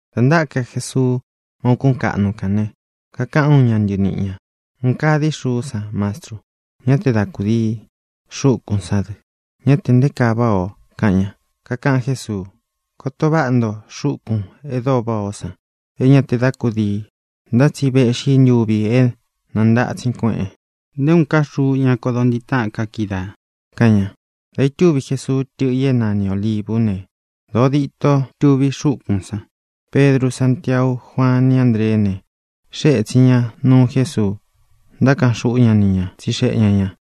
Dā ntáka Jesuu má ūkún kaꞌnu kān ne, kakaꞌan úun ña ntɨniꞌi ñā: —¡Un kaa dií xuú san, Mastru! ¡Ñá te da kūdii! ¡Xūkún san dɨ! ¡Ñá tē nté kaa váꞌā o! —kaꞌan ña. Kakaꞌan Jésuu: —Koto váꞌa nto xúkūn e dóo váꞌā ó san, é ña te da kúdii. Ntá tsi véꞌxī ntuvi é nantatsin kueꞌen. Nté uun ká xuu ña kodo ntiꞌi táꞌān ka kídaā —kaꞌan ña. Dā itúvi Jesuu tɨ́ꞌɨ i é nani Ōlivú ne, dōo dîto tuví xúkūn san. Pedru, Sántiau, Juaan, ni Ándreé ne, xée ētsin ña nuu Jésuu, ntákaꞌan xuꞌú ña ni ña, tsixeꞌe ña ñā: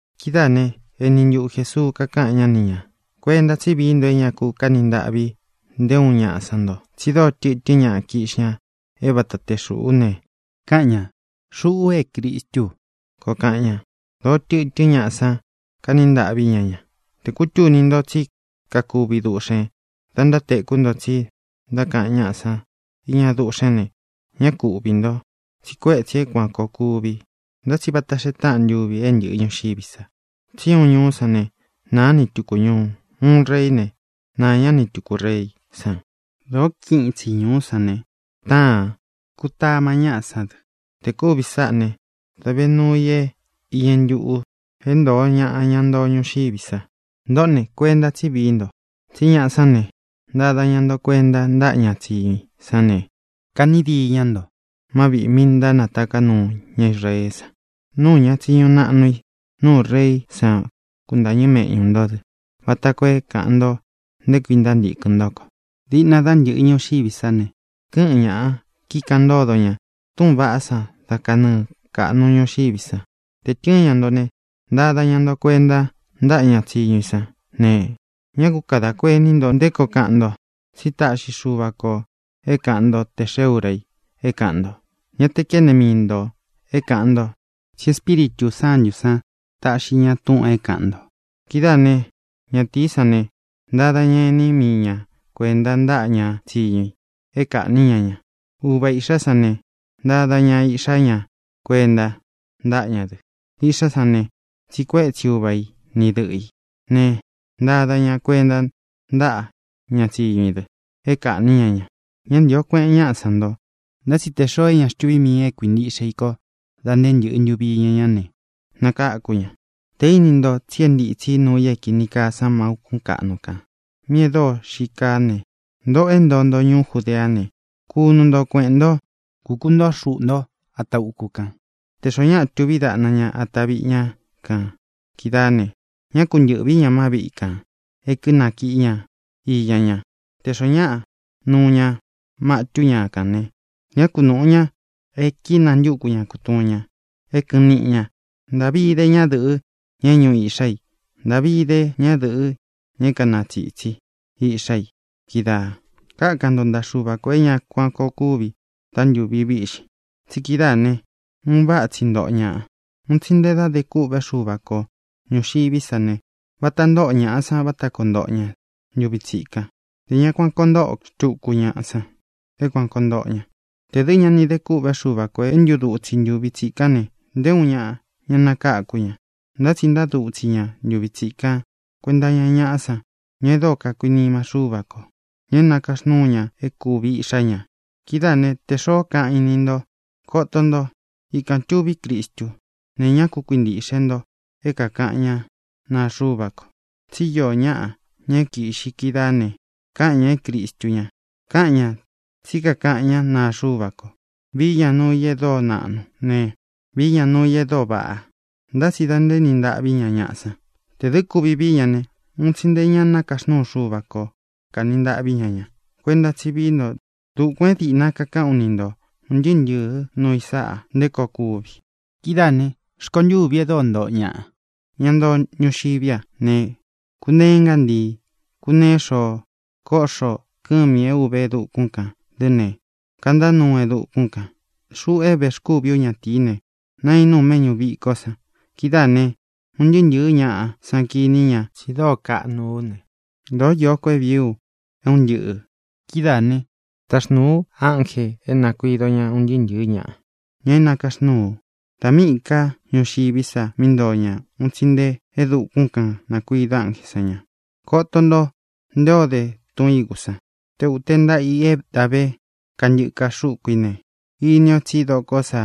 Kidáā né, eni ntuꞌu Jēsuu kakáꞌan ñá ni ñā: —Kuenta tsí vií nto é ña kaní ntaꞌvi nté uun ñaꞌa san nto. Tsi dóo tɨtɨ́n ñaꞌa kiꞌxi ña é vata te xūꞌú ne, káꞌan ñā: “Xuꞌu é Cristú u”, koo kaꞌan ña. Dōó tɨtɨ́n ñaꞌa san kaní ntaꞌví ña ña. ʼTē kútuni nto tsí kakuvi duꞌxēn da ntátekú nto tsi ntákaꞌan ñáꞌa san iña duꞌxén ne, ñá ku uꞌvī nto. Tsi kuétsī é kuān koo kuvi, ntá tsi vata xee táꞌan ntuvi é ntɨ̄ꞌɨ ñuxiví sa. Tsí uun ñuú san ne, nāá ni tūku ñuu. Uun reí ne, naā ñá ni tūku reí san. Dōó kiꞌin itsi ñūú san ne, táān; kutama ñáꞌa sán dɨ. Tē kúvī sáꞌā né, dā ve nuu i é īñɨ ntuꞌu é ntōꞌo ñaꞌa, ña ntoo ñuxiví sa. ʼNtōꞌó ne, kuenta tsí vií nto. Tsí ñaꞌa sán ne, ntada ña nto kuenta ntáꞌa ña tsiñu i sán ne, kaꞌní diīn ñá nto má viꞌī mi ntánataká nuu ña Israeé san. Nuu ña tsiñu naꞌnu i, nuu reí san kuntāñɨ́ meꞌñū ntó dɨ vata koo é kāꞌan nto nté kui ntántīkɨn ntó ko. Diꞌna dá ntɨ̄ꞌɨ ñuxiví sa ne, kɨ́ꞌɨn ñāꞌa, kíkaꞌan ntódo ña túꞌūn vaꞌá san dá kanɨɨ kāꞌnu ñuxiví san. Te tɨ̄ɨn ña nto ne, ntada ña nto kuenta ntáꞌa ña tsiñu i sán ne, ñá ku kadā kuení nto nté koo kaꞌan nto. Tsí taꞌxi Xuva kō é kāꞌan ntó tē xee úra i é kāꞌan nto. Ñá te kene mii ntō é kāꞌan nto, tsí Espíritū Sántū san taꞌxi ña túꞌūn é kāꞌan nto. Kidáā né, ñatīí san ne, ntada ña ení mii ña kuēnta ntáꞌa ña tsiñu i é kaꞌnī ñá ña. Uva īꞌxá san ne, ntada ña iꞌxá ña kuenta ntáꞌa ña dɨ. Iꞌxá san ne, tsiꞌi kuétsi uva i ni dɨꞌɨ ī ne, ntada ña kuenta ntáꞌa ña tsiñu i dɨ é kaꞌnī ñá ña. Ñá ntīo kueꞌen ñáꞌa san nto, ntá tsi tē xoo é ña xtuví mii ī é kuīntiꞌxe i kó dā nté ntɨ̄ꞌɨ ntuvi iña ñá ne, nakáku ña. ʼTē íni nto tsi é ntītsi nuu i é kīni kaa san má ūkún kaꞌnu kān míꞌī e dóo xii kaa ne, ntōꞌo é ntoo nto ñuú Judeá ne, kunu nto kueꞌēn ntó, kukūntoó xuꞌū ntó ata uku kan. Tē xoó ñaꞌa tuví daꞌna ña ata viꞌi ña kan kídaā ne, ñá ku ntɨ̄ꞌví ña má viꞌi kān e kínakíꞌi ña iña ña. Tē xoó ñaꞌa nuu ña matú ña kān ne, ñá ku nūꞌu ña e kínantúku ña kutuun ña é kɨꞌɨn niꞌi ña. ¡Ntāꞌvi ide ñádɨ̄ꞌɨ, ña é ñūꞌu iꞌxá i! ¡Ntāꞌvi ide ñádɨ̄ꞌɨ, ña é kanatsītsi iꞌxá i kídaā! Kákan nto ntaꞌa Xuva kō é ña kuan kōo kúvi dá ntūvi víꞌxin. Tsi kídaā né, un váꞌa tsi ntoꞌo ñaꞌa. Un tsi nte dá de kûꞌvé Xuva ko ñūxiví sa ne, vata ntóꞌo ñāꞌa san vata koo ntoꞌo ña ntuvi tsikan. Ntē ña kuan koo ntóꞌo xtuku ñaꞌa san é kuān koo ntoꞌo ña. Tē dɨ́ ña ni dé kûꞌvé Xuva kō é ntudutsi ntūvi tsikán ne, nté uun ñaꞌa ña nakáku ña. Ntá tsi ntadutsi ña ntuvi tsikan kuenta iña ñaꞌá san, ña e dóo kakuinima Xúva kō, ña é nakaxnúu ña é kūvi iꞌxá ña. ʼKidáā né, tē xoó kaꞌan í ni ntō: “¡Koto nto! ¡Ikān tuví Cristu!”, ne, ñá ku kuintīꞌxe nto é kākaꞌan ñá naa Xuva ko. Tsí iō ñáꞌa, ña é kīꞌxi kídaā ne, káꞌan ñā é Cristu ña. Káꞌan ñā tsí kakaꞌan ñá naa Xuva ko. Vií ña nuu i e dóo naꞌnu ne, vií ña nuu i e dóo vaꞌa. Ntá tsi da ntaéni ntaꞌví ña ñaꞌa san. Tē dɨ́ kuvi vií ña ne, un tsi nte ña nakaxnúu Xuva kō kaní ntaꞌví ña ña. Kuenta tsí vií nto. Dukuān é dīꞌna kakaꞌán u ni nto ūn ntɨɨ́ ntɨ̄ɨ́ nuu i sáꞌā nté koo kúvi. ʼKidáā ne, rkontûví e dóo ntoꞌo ñaꞌa, ña ntoo ñuxiví a ne, kuneé ngántii, kuneé xoo. Kóꞌxo kɨ̄mi é ūve e dukún kān dɨ́ ne, kantá nuu e dukún kān. Xuꞌu é vēxkúvi ú ñatīí ne, nainú u meꞌñú vikó san. Kidáā ne, un ntɨɨ́ ntɨ̄ɨ́ ñaꞌa san kiní ña tsi dóo kaꞌnu ú ne, dōó īó ko é vīí u é un ntɨꞌɨ̄. Kidáā né, taxnūu u ánjē é nākuido ña un ntɨɨ́ ntɨ̄ɨ́ ñaꞌa, ña é nākaxnúu u. Dā míꞌī ká ñuxiví sa mí ntoo ña un tsi nte e dukún kān nakuido ánjē san ña. ʼKoto nto nté o de tun ígū san. Te ūte ntaꞌa i é da ve kantɨka xúku ī ne, ini o tsí dokó sa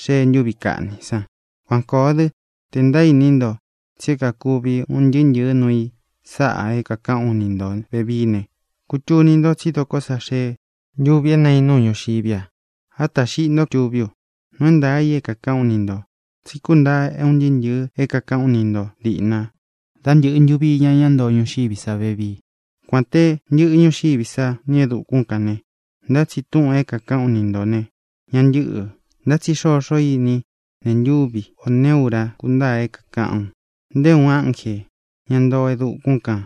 xee ntuví kaꞌni san. Kuan kōo dɨ́, tē ntaíní nto tsi é kakūvi un ntɨɨ́ ntɨ̄ɨ́ nuu i sáꞌā é kākaꞌán u ni ntō vevií ne, kutuni nto tsi dóko sā xee ntúvī é nainú u ñuxiví a. Átā xiꞌi xnto túvi u. Nuu é ntaā i é kākaꞌán u ni ntō, tsí kuntaa é un ntɨꞌɨ̄ é kākaꞌán u ni nto dīꞌna dá ntɨ̄ꞌɨ ntuvi iña ñá ntoo ñuxiví sa vevii. Kuān te ntɨꞌɨ ñuxiví sa nī e dukún kān ne, ntá tsi túꞌūn é kākaꞌán u ni ntō ne, ña ntɨ́ꞌɨ̄. ʼNtá tsi xoxó ini í nee ntúvi ō neé ura kúntaa é kākaꞌán u; nté uun ánjē, ña ntoo e dukún kan,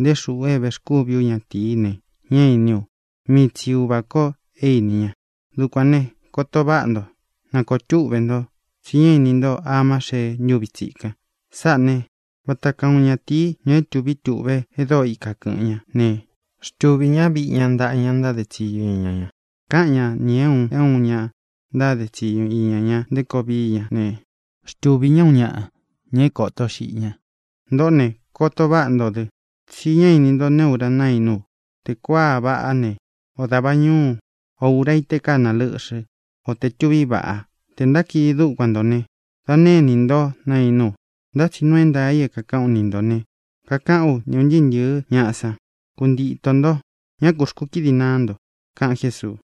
nté xuꞌu é vēxkúvi ú ñatīí ne, ñá īní u; mii tsi Uvā ko é ini ña. ʼDukuān ne, koto váꞌa nto. Na kōo túꞌve nto, tsi ñá ini nto amá xee ntúvi tsikan. Sáꞌā né, vata kaa uun ñatīí, ña é tūví tuꞌve e dóo ika kɨ̄ꞌɨn ñá, ne, xtuvī ñá viꞌi ña ntaꞌa ña ntáde tsiñu iña ña. Káꞌan ña nī é un é un ña ntáde tsiñu iña ña nté koo vií ña ne, xtuvī ñá uun ñaꞌa, ña é kōto xiꞌi ña. Ntōꞌó ne, koto váꞌa nto dɨ, tsí ñá ini nto neé ura naínú u: tē kuaa vaꞌá ne, o dava ñūu, o ura í tē kána lɨ́ꞌxɨ, o tē tuví vaꞌa. Tē ntákidi dúkuan ntō ne, da née inī ntó nainú u. Ntá tsi nuu i é kākaꞌán u ni ntō ne, kakaꞌán u ni ūn ntɨɨ́ ntɨ̄ɨ́ ñaꞌa san: ¡Kuntitō nto! ¡Ñá kū xkúkidi naá nto! —kaꞌan Jésuu.